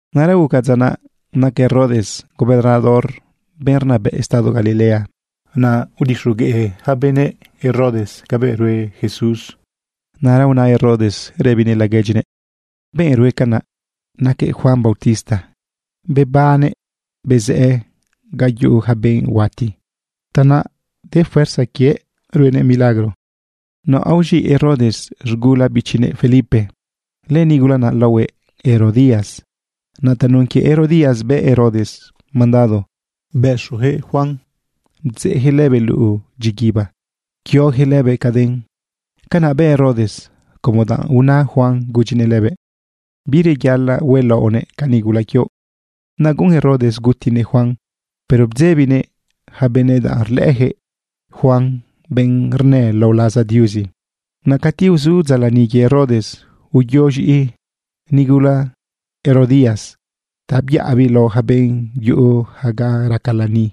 Naꞌra guca dza naꞌ naca Herodes gobernador, benꞌ rnabëꞌ estado Galilea. Naꞌ udixogueꞌ yaca benëꞌ Herodes cabëꞌ rue Jesús. Naꞌra una Herodes rëbinëꞌ laguedyinëꞌ: ―Benꞌ rue canaꞌ naquëꞌ Juan bautista. Bebannëꞌ bezëꞌë ga yuꞌu ja benꞌ huati. Tanaꞌ de fuerza quiëꞌ ruenëꞌ milagro. Naꞌ aoz̃iꞌ Herodes z̃gula bichinëꞌ Felipe. Lënigula naꞌ laohuëꞌ Herodías. Naꞌ tanun quie Herodías bë Herodes mandado bëxuyaquëꞌ Juan, bdzeꞌjëꞌ lëbëꞌ luꞌu dyiguiba, pquiojëꞌ lëbëꞌ caden. Canaꞌ bë Herodes como danꞌ una Juan gudyinëꞌ lëbëꞌ: ―Bireyaꞌalaꞌ huelaꞌonëꞌ ca nigula quioꞌ. Naꞌ guꞌun Herodes gutinëꞌ Juan, pero bdzebinëꞌ ja benëꞌ danꞌ rlëꞌëjëꞌ Juan benꞌ rnë lao laza Diuzi. Naꞌ cati uzu dza lani quie Herodes, uyo z̃iꞌi nigula Herodías ta byaꞌabiꞌ lao ja benꞌ yuꞌu ja ga raca lani.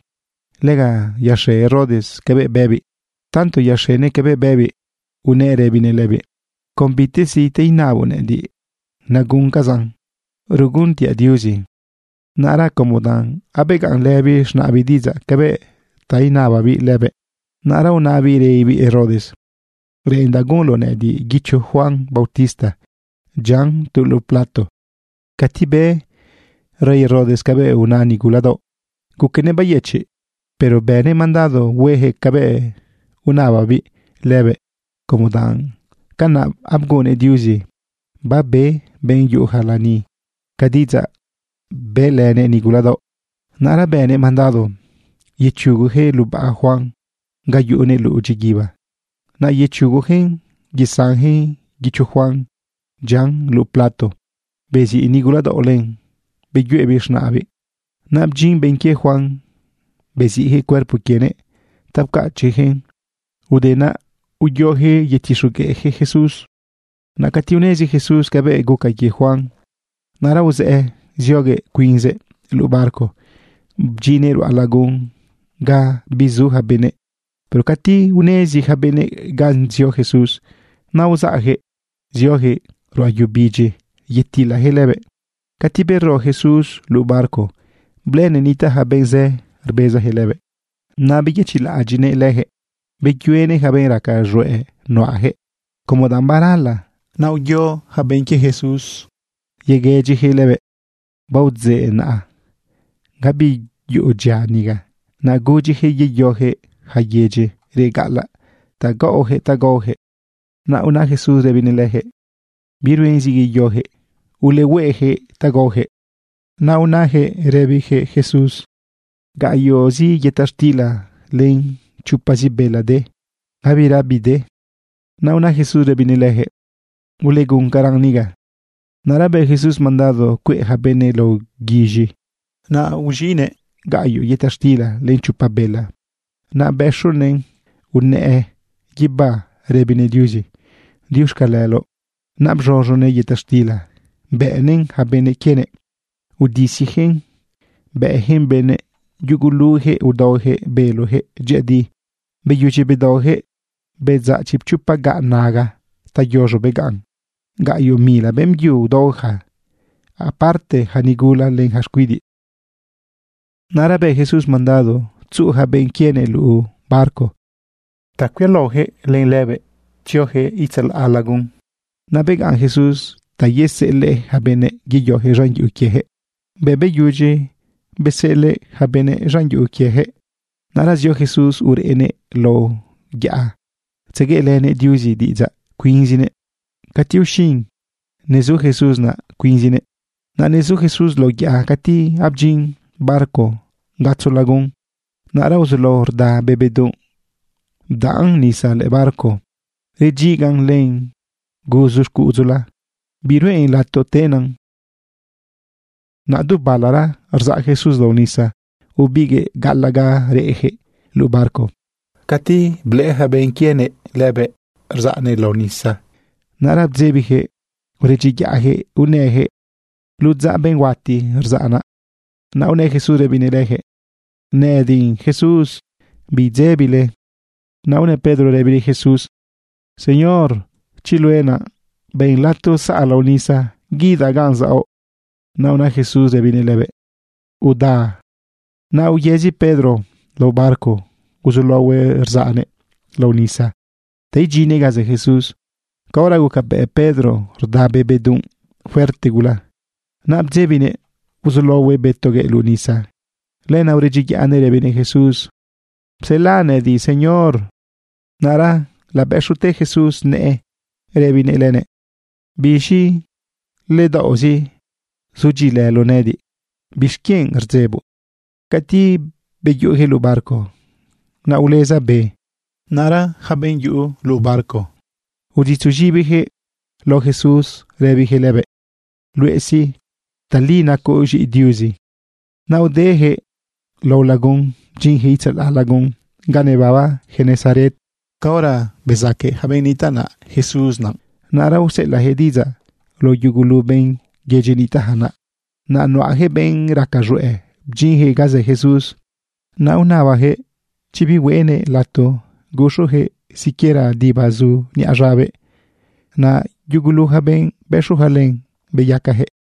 Lega yaxe Herodes cabëꞌ bëbiꞌ. Tanto yaxenëꞌ cabëꞌ bëbiꞌ unëꞌ rëbinëꞌ lëbiꞌ: ―Con bitezi ta inaboꞌ nëꞌëdiꞌ, naguncazaꞌn, ruguntiaꞌ Diuzi. Naꞌra como danꞌ abegaꞌnlëbiꞌ z̃naꞌbiꞌ diꞌidzaꞌ cabëꞌ inababiꞌ lëbëꞌ, naꞌra unabiꞌ rëbibiꞌ Herodes: ―Reꞌendaꞌ gunloꞌ nëꞌëdiꞌ guicho Juan bautista dyian tu luꞌu plato. Cati be rey Herodes cabëꞌ una nigula daoꞌ, guquenëꞌ bayëchiꞌ. Pero bënëꞌ mandado huejëꞌ cabëꞌ unababiꞌ lëbëꞌ, como danꞌ canaꞌ abgunnëꞌ Diuzi, babe benꞌ yuꞌuja lani ca diꞌidzaꞌ bëꞌlënëꞌ nigula daoꞌ. Naꞌra bënëꞌ mandado yechugojëꞌ lubaꞌ Juan ga yuꞌunëꞌ luꞌu dyiguiba. Naꞌ yechugojëꞌn yesanjëꞌ guicho Juan dyian luꞌu plato. Beziꞌ nigula daoꞌ len, beyuꞌebiꞌn z̃naꞌbiꞌ. Naꞌ bdyin benꞌ quie Juan beziꞌjëꞌ cuerpo quienëꞌ ta pcachiꞌjëꞌn. Ude naꞌ, uyojëꞌ yetixogueꞌjëꞌ Jesús. Naꞌ cati unezi Jesús cabëꞌ guca quie Juan, naꞌra uzëꞌë zioguëꞌ cuinzëꞌ luꞌu barco bdyinnëꞌ ruꞌa lagun ga bizu ja benëꞌ. Pero cati unezi ja benëꞌ ganꞌ zio Jesús, naꞌ uzaꞌjëꞌ ziojëꞌ ruꞌa yu bidyi yetilajëꞌ lëbëꞌ. Cati bero Jesús luꞌu barco, blëꞌënëꞌ nitaꞌ ja benꞌ zë rbezajëꞌ lëbëꞌ. Naꞌ beyëchiꞌlaꞌadyiꞌnëꞌ lëjëꞌ, beyuenëꞌ ja benꞌ raca z̃hueꞌ nuꞌajëꞌ. Como danꞌ barala, naꞌ uyo ja benꞌ quie Jesús yeguëdyijëꞌ lëbëꞌ: ―Baodzeꞌ naꞌa. Gabi yuꞌu dyia niga. Naꞌ gudyijëꞌ yeyojëꞌ ja yedyi reꞌ gaꞌalaꞌ ta gaꞌojëꞌ ta gaojëꞌ. Naꞌ una Jesús rëbinëꞌ lëjëꞌ: ―Biruen zi yeyojëꞌ. Ulehueꞌjëꞌ ta gaojëꞌ. Naꞌ unajëꞌ rëbijëꞌ Jesús: ―Gaꞌyoꞌzi yëta xtila len chopazi bela de. Gabira bide. Naꞌ una Jesús rëbinëꞌ lëjëꞌ: ―Uleguncaran niga. Naꞌra bë Jesús mandado cueꞌ ja benëꞌ lao guiz̃i. Naꞌ aoz̃iꞌnëꞌ gaꞌyoꞌ yëta xtila len chopa bela. Naꞌ bëxunëꞌn unëꞌë guibá rëbinëꞌ Diuzi: “Diuxcaleloꞌ.” Naꞌ bz̃uz̃unëꞌ yëta xtila, bëꞌnëꞌn ja benꞌ quienëꞌ, udisijëꞌn bëꞌjëꞌn benëꞌ. Yugulujëꞌ udaojëꞌ belojëꞌ dyëꞌëdi. Beyudyi bedaojëꞌ, bedzaꞌ chipchopa gaꞌ naga ta yoz̃o begaꞌn. Gaꞌyoꞌ mila beꞌmbyu udaoja, apartela ja nigula len ja xcuidiꞌ. Naꞌra bë Jesús mandado tzuꞌu ja benꞌ quienëꞌ luꞌu barco ta cuialaojëꞌ lëbëꞌ tziojëꞌ itzalaꞌ lagun. Naꞌ begaꞌn Jesús ta yeseꞌelëꞌ ja benëꞌ yeyojëꞌ z̃an yuꞌu quiejëꞌ. Bëꞌ beyudyi beseꞌelëꞌ ja benëꞌ z̃an yuꞌu quiejëꞌ, naꞌra zio Jesús urënëꞌ lao yaꞌa tzegueꞌlënëꞌ Diuzi diꞌidzaꞌ cuinzinëꞌ. Cati uxin, nezu Jesús naꞌ cuinzinëꞌ. Naꞌ nezu Jesús lao yaꞌa cati abdyin barco gatzo lagun. Naꞌra uzulao rda be bedunꞌ, bdaꞌn nisa lëꞌë barco, redyigan len guzu xcuꞌudzula, biruꞌen lato tenan. Naꞌ du balara rzaꞌ Jesús lao nisa ubiguëꞌ gaꞌalaꞌ ga reꞌjëꞌ luꞌu barco. Cati blëꞌë ja benꞌ quienëꞌ lëbëꞌ rzaꞌnëꞌ lao nisa, naꞌra bdzebijëꞌ uredyiyaꞌjëꞌ unëjëꞌ: ―¡Ludzaꞌ benꞌ huati rzaꞌ naꞌ! Naꞌ unë Jesús rëbinëꞌ lëjëꞌ: ―¡Nëꞌëdiꞌ Jesús! ¡Bidzebile! Naꞌ una Pedro rëbinëꞌ Jesús: ―Señor, chi luëꞌ naꞌ, ben lato saꞌ lao nisa guidaꞌ ganꞌ zaoꞌ. Naꞌ una Jesús rëbinëꞌ lëbëꞌ: ―Uda, chiꞌ. Naꞌ uyëzi Pedro lao barco uzulaohuëꞌ rzaꞌnëꞌ lao nisa ta idyinnëꞌ ga zë Jesús. Caora gucabëꞌ Pedro rda be bedunꞌ fuerte gula, naꞌ bdzebinëꞌ uzulaohuëꞌ bëtoguëꞌ luꞌu nisa. Lenaꞌ uredyiyaꞌnëꞌ rëbinëꞌ Jesús: ―Psela nëꞌëdiꞌ, Señor. Naꞌra labëxute Jesús nëꞌë rëbinëꞌ lënëꞌ: ―¡Biz̃i ledaoꞌzi zudyiꞌilëloꞌ nëꞌëdiꞌ! ¿Bixquienꞌ rdzeboꞌ? Cati beyuꞌujëꞌ luꞌu barco, naꞌ uleza be. Naꞌra yaca benꞌ yuꞌu luꞌu barco, uditzuz̃ibijëꞌ lao Jesús rëbijëꞌ lëbëꞌ: ―Luëꞌ sí, tali nacoꞌ z̃iꞌi Diuzi. Naꞌ udejëꞌ lao lagun bdyinjëꞌ itzalaꞌ lagun ga nebaba Genesaret. Caora bezaque ja benꞌ nitaꞌ naꞌ Jesús naꞌ, naꞌra useꞌelaꞌjëꞌ diꞌidzaꞌ lao yugulu benꞌ yedyi nitaꞌja naꞌ. Naꞌ nuꞌajëꞌ benꞌ raca z̃hueꞌ bdyinjëꞌ ga zë Jesús. Naꞌ unabajëꞌ chi bihueꞌnëꞌ lato guxujëꞌ siquiera diba zu niꞌa z̃abëꞌ. Naꞌ yugulu ja benꞌ bëxuja len, beyacajëꞌ.